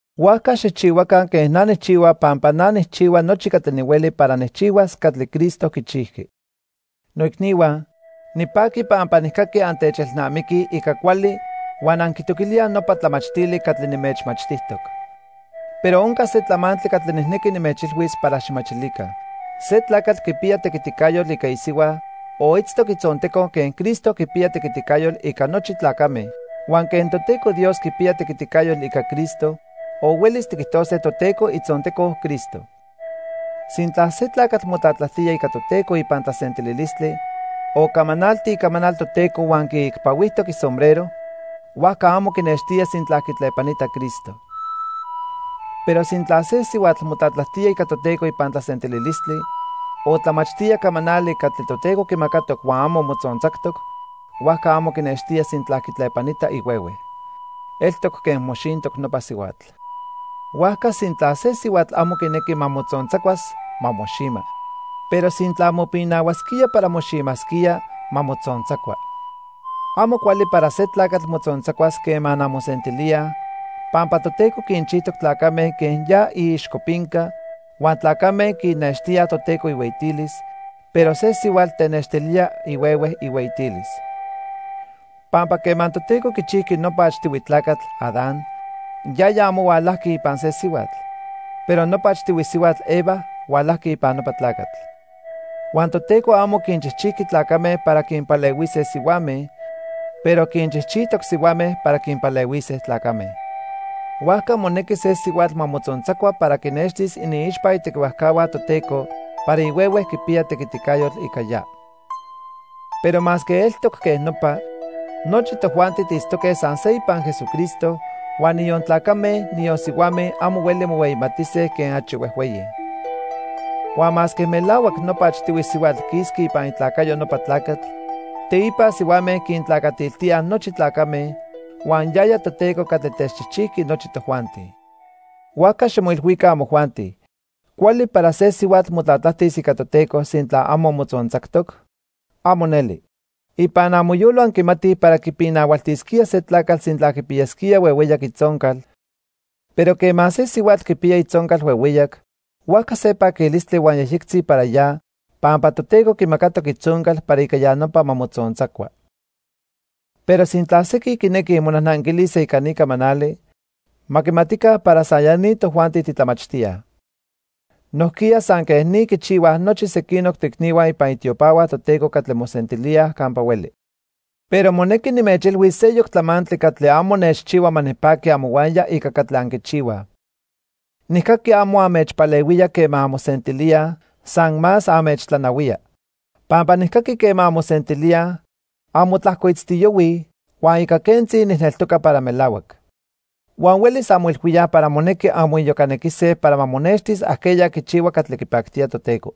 Huajca xijchihuaca quen na nijchihua pampa na nijchihua nochi catli nihueli para nijchihuas catli Cristo quichijqui. Noicnihua, nipaqui pampa nijcaqui antechelnamiquij ica cuali huan anquitoquilíaj nopa tlamachtili catli nimechmachtijtoc. Pero onca se tlamantli catli nijnequi nimechilhuis para xijmachilica. Se tlacatl quipiya tequiticayotl ica isihua o itztoc itzonteco quen Cristo quipiya tequiticayotl ica nochi tlacame, huan quen Toteco Dios quipiya tequiticayotl ica Cristo o huelis tiquijtose Toteco itzonteco Cristo. Sintla se tlacatl motlatlajtía ica Toteco ipan tlasentililistli o camanalti icamanal Toteco huan quiicpahuijtoc isombrero, huajca amo quinextía sintla quitlepanita Cristo. Pero sintla se sihuatl motlatlajtía ica Toteco ipan tlasentililistli o tlamachtía camanali catli Toteco quimacatoc huan amo motzontzactoc, huajca amo quinextía sintla quitlepanita ihuehue. Eltoc quen moxintoc nopa sihuatl. Huajca sintla se sihuatl amo quinequi ma motzontzacuas, ma moxima. Pero sintla mopinahuasquía para moximasquía, ma motzontzacua. Amo cuali para se tlacatl motzontzacuas quema anmosentilíaj, pampa Toteco quinchijtoc tlacame quen ya iixcopinca huan tlacame quinextíaj Toteco ihueyitilis, pero se sihuatl tenextilía ihuehue ihueyitilis. Pampa quema Toteco quichijqui nopa achtihui tlacatl, Adán, yaya amo hualajqui ipan se sihuatl, pero nopa achtihui sihuatl, Eva, hualajqui ipan nopa tlacatl. Huan Toteco amo quinchijchijqui tlacame para quinpalehuise sihuame, pero quinchijchijtoc sihuame para quinpalehuise tlacame. Huajca monequi se sihuatl ma motzontzacua para ma quinextis iniixpa itequihuajcahua Toteco para ihuehue quipiya tequiticayotl ica ya. Pero masque eltoc quej nopa, nochi tojuanti tiitztoque san se ipan Jesucristo, huan niyon tlacame, niyon sihuame amo hueli mohueyimatise quen achi huejhueyi. Huan masque melahuac nopa achtihui sihuatl quisqui ipan itlacayo nopa tlacatl, teipa sihuame quintlacatiltíaj nochi tlacame, huan yaya Toteco catli techchijchijqui nochi tojuanti. Huajca ximoilhuica, amojuanti. ¿Cuali para se sihuatl motlatlajtis ica Toteco, sintla amo motzontzactoc? ¡Amo neli! Ipan amoyolo anquimatij para quipinahualtisquía se tlacatl sintla quipiyasquía huehueyac itzoncal, pero quema se sihuatl quipiya itzoncal huehueyac, huajca se paquilistli huan yejyectzi para ya pampa Toteco quimacatoc itzoncal para ica ya nopa ma motzontzacua. Pero sintla sequin quinequij monajnanquilise ica ni camanali, ma quimatica para san ya ni tojuanti titlamachtíaj. Nojquiya san quej ni quichihuaj nochi sequinoc toicnihua ipan itiopahua Toteco catli mosentilíaj campa hueli. Pero monequi nimechilhuis seyoc tlamantli catli amo nechchihua ma nipaqui amohuaya ica catli anquichihuaj. Nijcaqui amo anmechpalehuía quema anmosentilíaj, san más anmechtlanahuía. Pampa nijcaqui quema anmosentilíaj, anmotlajcoitztiyohuij, huan ica quentzi nijneltoca para melahuac. Huan huelis anmoilhuíaj para monequi anmoiyocanequise para ma monextis ajqueya quichihua catli quipactía Toteco.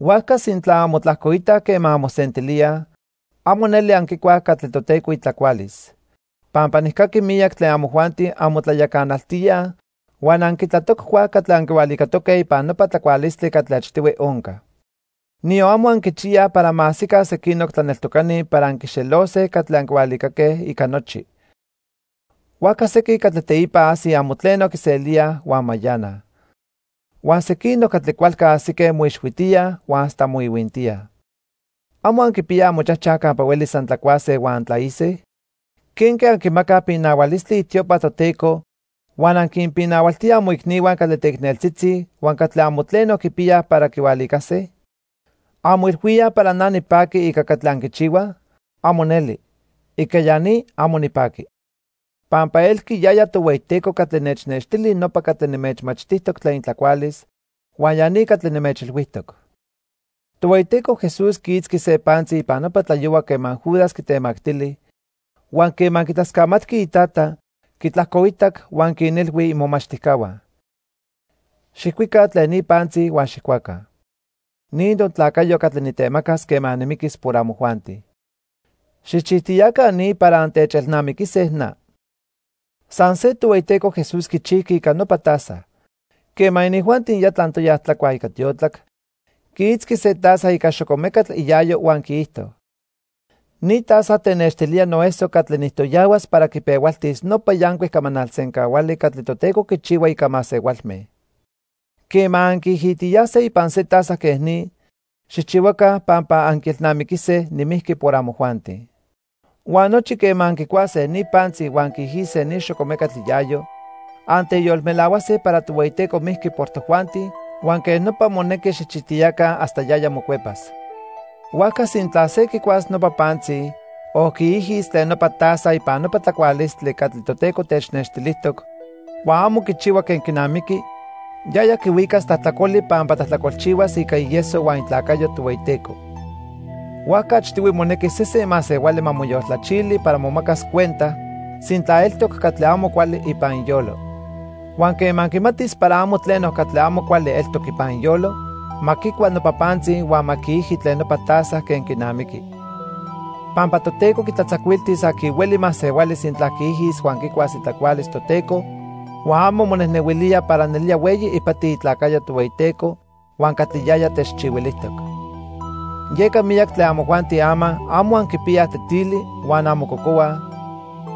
Huajca sintla anmotlajcoitaj quema anmosentilíaj, amo neli anquicuaj catli Toteco itlacualis, pampa nijcaqui miyac tlen amojuanti anmotlayacanaltíaj huan anquitlatoccuaj catli anquihualicatoque ipan nopa tlacualistli catli achtihui onca. Niyon amo anquichiyaj para ma ajsica sequinoc tlaneltocani para anquixelose catli anquihualicaque ica nochi. Huajca sequin catli teipa ajsij amo tleno quiselíaj huan mayanaj. Huan sequinoc catli cualca ajsique moixhuitíaj huan hasta moihuintíaj. ¿Amo anquipiyaj amochajchaj campa huelis antlacuase huan antlaise? ¿Quenque anquimacaj pinahualistli itiopa Toteco huan anquinpinahualtíaj amoicnihua catli teicneltzitzi huan catli amo tleno quipiyaj para quihualicase? ¿Anmoilhuíaj para na nipaqui ica catli anquichihuaj? ¡Amo neli! ¡Ica ya ni, amo nipaqui! Pampa elqui yaya Tohueyiteco catli nechnextili nopa catli nimechmachtijtoc tlen itlacualis, huan ya ni catli nimechilhuijtoc. Tohueyiteco Jesús quiitzqui se pantzi ipan nopa tlayohua quema Judas quitemactili, huan quema quitlascamatqui iTata, quitlajcoitac, huan quinilhui imomachtijcahua: "Xijcuica tlen ni pantzi huan xijcuaca. Ni notlacayo catli nitemacas quema nimiquis por amojuanti. Xijchijtiyaca ni para antechelnamiquise na." San se Tohueyiteco Jesús quichijqui ica nopa taza. Quema inijuanti ya tlantoya tlacuaj ica tiotlac, quiitzqui se taza ica xocomecatl iayo huan quiijto: "Ni taza tenextilía noeso catli nijtoyahuas para quipehualtis nopa yancuic camanal sencahuali catli Toteco quichihua ica masehualme. Quema anquiijitiyase ipan se taza quej ni, xijchihuaca pampa anquielnamiquise nimijqui por amojuanti." Huan nochipa quema anquicuase ni pantzi huan anquiijise ni xocomecatl iayo, anteyolmelahuase para Tohueyiteco mijqui por tojuanti huan quej nopa monequi xijchijtiyaca hasta yaya mocuepas. Huajca sintla se quicuas nopa pantzi o quiijis tlen nopa taza ipan nopa tlacualistli catli Toteco technextilijtoc, huan amo quichihua quen quinamiqui, yaya quihuicas tlajtlacoli pampa tlajtlacolchihuas ica ieso huan itlacayo Tohueyiteco. Huajca achtihui monequi sesen masehuali ma moyoltlachili para momacas cuenta sintla eltoc catli amo cuali ipan iyolo. Huan quema quimatis para amo tleno catli amo cuali eltoc ipan iyolo, ma quicua nopa pantzi huan ma quiiji tlen nopa taza quen quinamiqui. Pampa Toteco quitlatzacuiltis aqui hueli masehuali sintla quiijis huan quicuas itlacualis Toteco huan amo monejnehuilía para nelía hueyi ipati itlacayo Tohueyiteco huan catli yaya techchihuilijtoc. Yeca miyac tlen amojuanti ama amo anquipiyaj tetili huan anmococohuaj;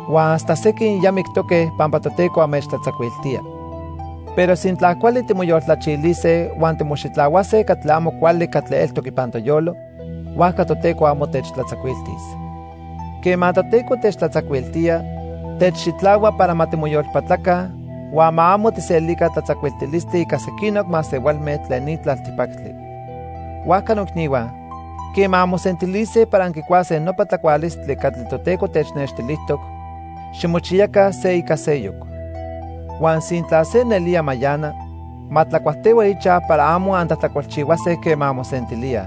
huan hasta sequin ya mictoque pampa Toteco anmechtlatzacuiltía. Pero sintla cuali timoyoltlachilise huan timoxitlahuase catli amo cuali catli eltoc ipan toyolo, huajca Toteco amo techtlatzacuiltis. Quema Toteco techtlatzacuiltía, techxitlahua para ma timoyolpatlaca huan ma amo tijselica tlatzacuiltilistli ica sequinoc masehualme tlen ni tlaltipactli. Huajca noicnihua, quema anmosentilise para anquicuase nopa tlacualistli catli Toteco technextilijtoc, ximochiyaca se ica seyoc. Huan sintla se nelía mayana, ma tlacuajtehua ichaj para amo antlajtlacolchihuase quema anmosentilíaj.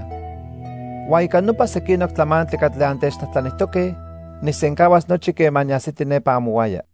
Huan ica nopa sequinoc tlamantli catli antechtlajtlanijtoque, nijsencahuas nochi quema niajsiti nepa amohuaya.